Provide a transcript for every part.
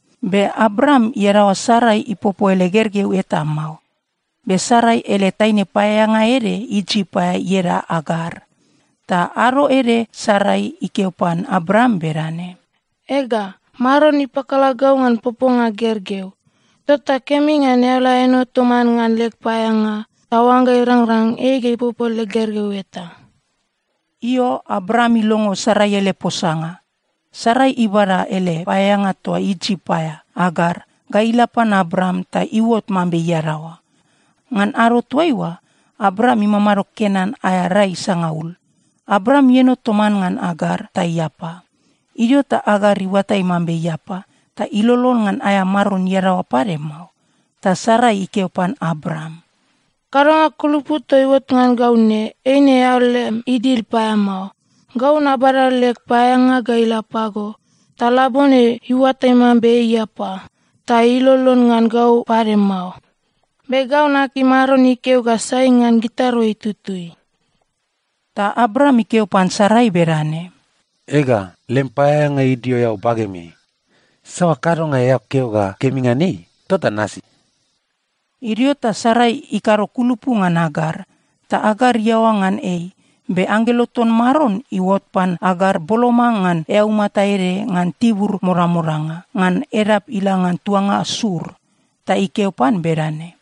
Be Abram iadaoa Sarai ipopo ele gergeu eta mao. Be Sarai ele taine paeaeanga ede Isip aea ieda Agar. Ta ado ede Sarai ikeo pan Abram bedane, “Ega, Maron ipakala gau ngan poponga gergeu. Tota kemi ngan eao la eno toman ngan leg paeaeanga, ta oangga irangrang, ei ga ipopo leg gergeu eta.” Io, Abram ilongo Sarai ele posanga. Sarai ibada ele paeaeanga toa Isip aea, Agar, ga ila pan Abram ta iuot mambe iadaoa. Ngan ado toaiua, Abram imamado Kenan aea rai sangaul. Abram ieno toman ngan Agar, ta iapa. Idio ta Agar iuatai mambe iapa, ta ilolon ngan aea maron iadaoa pade mao. Ta Sarai ikeo pan Abram, “Kadonga kulupu toa iuot ngan gau ne, eine eao lem idil paeamao. Gau nabada leg paeaeanga ga ila pago, ta labone iuatai mambe ei iapa, ta ilolon ngan gau pade mao. Be gau nakim Maron ikeo ga sai ngan gitarua itutui.” Ta Abram ikeo pan Sarai bedane, “Ega, lem paeaeanga idio eao bagemeai. Saoa kadonga eao keo ga kemi ngan ei, tota nasi.” Idio ta Sarai ikado kulupu ngan Agar, ta Agar iaoa ngan ei. Be anggelo ton Maron iuot pan Agar boloma ngan eaumata ede ngan tibur modamodanga, ngan edap ila ngan tuanga Sur. Ta ikeo pan bedane,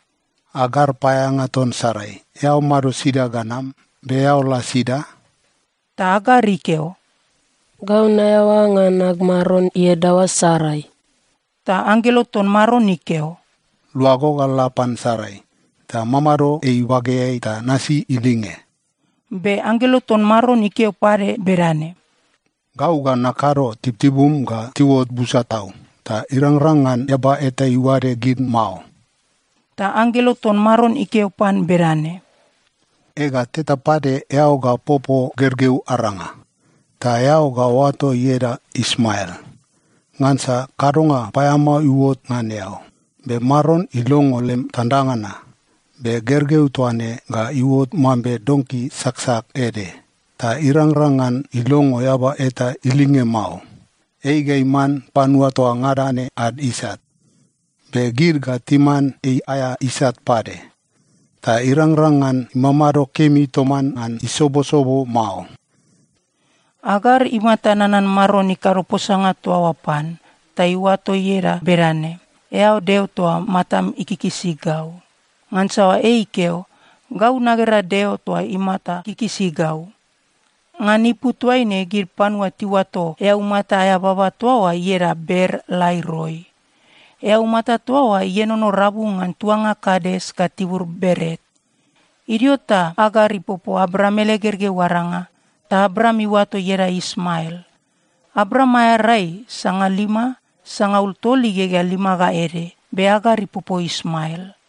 “Agar, paeaeanga ton Sarai, eao mado sida ga nam, be eao la sida?” Ta Agar ikeo, “Gau naeaoa ngan ag maron iadaoa, Sarai.” Ta anggelo ton Maron ikeo, “Luago ga la pan Sarai, ta mamado ei ibageai ta nasi ilinge.” Be anggelo ton Maron ikeo pade bedane, “Gau ga nakado tibutibum ga tiuot busa tau, ta irangrang ngan eaba eta iuade gid mao.” Ta anggelo ton Maron ikeo pan bedane, “Ega, teta pade eao ga popo gergeu aranga. Ta eao ga oato ieda Ismael. Ngansa kadonga paeamao iuot ngan eao, be Maron ilongo lem tandanga na. Be gergeu toa ne ga iuot mambe donki saksak ede, ta irangrang ngan ilongo eaba eta ilinge mao. Ei ga iman panua toa ngada ne ad isat, be gid ga timan ei aea isat pade. Ta irangrang ngan imamado kemi toman ngan isobosobo mao.” Agar imata nanan Maron ikado posanga toa oa pan, ta iuato ieda bedane, “Eao Deo toa matam ikikisi gau.” Ngansa ei ikeo, “Gau nagera Deo toa imata kikisi gau.” Ngan ipu toaine, gid panua tiuato eaumata aea baba toa oa ieda Ber-Laai-Roi. Eaumata toa oa ienono rabu ngan tuanga Kades ga tibur Beret. Idio ta Agar ipopo Abram ele gergeu aranga, ta Abram iuato ieda Ismael. Abram aea rai sangalima sangaul tol igegea lima ga ede, be Agar ipopo Ismael.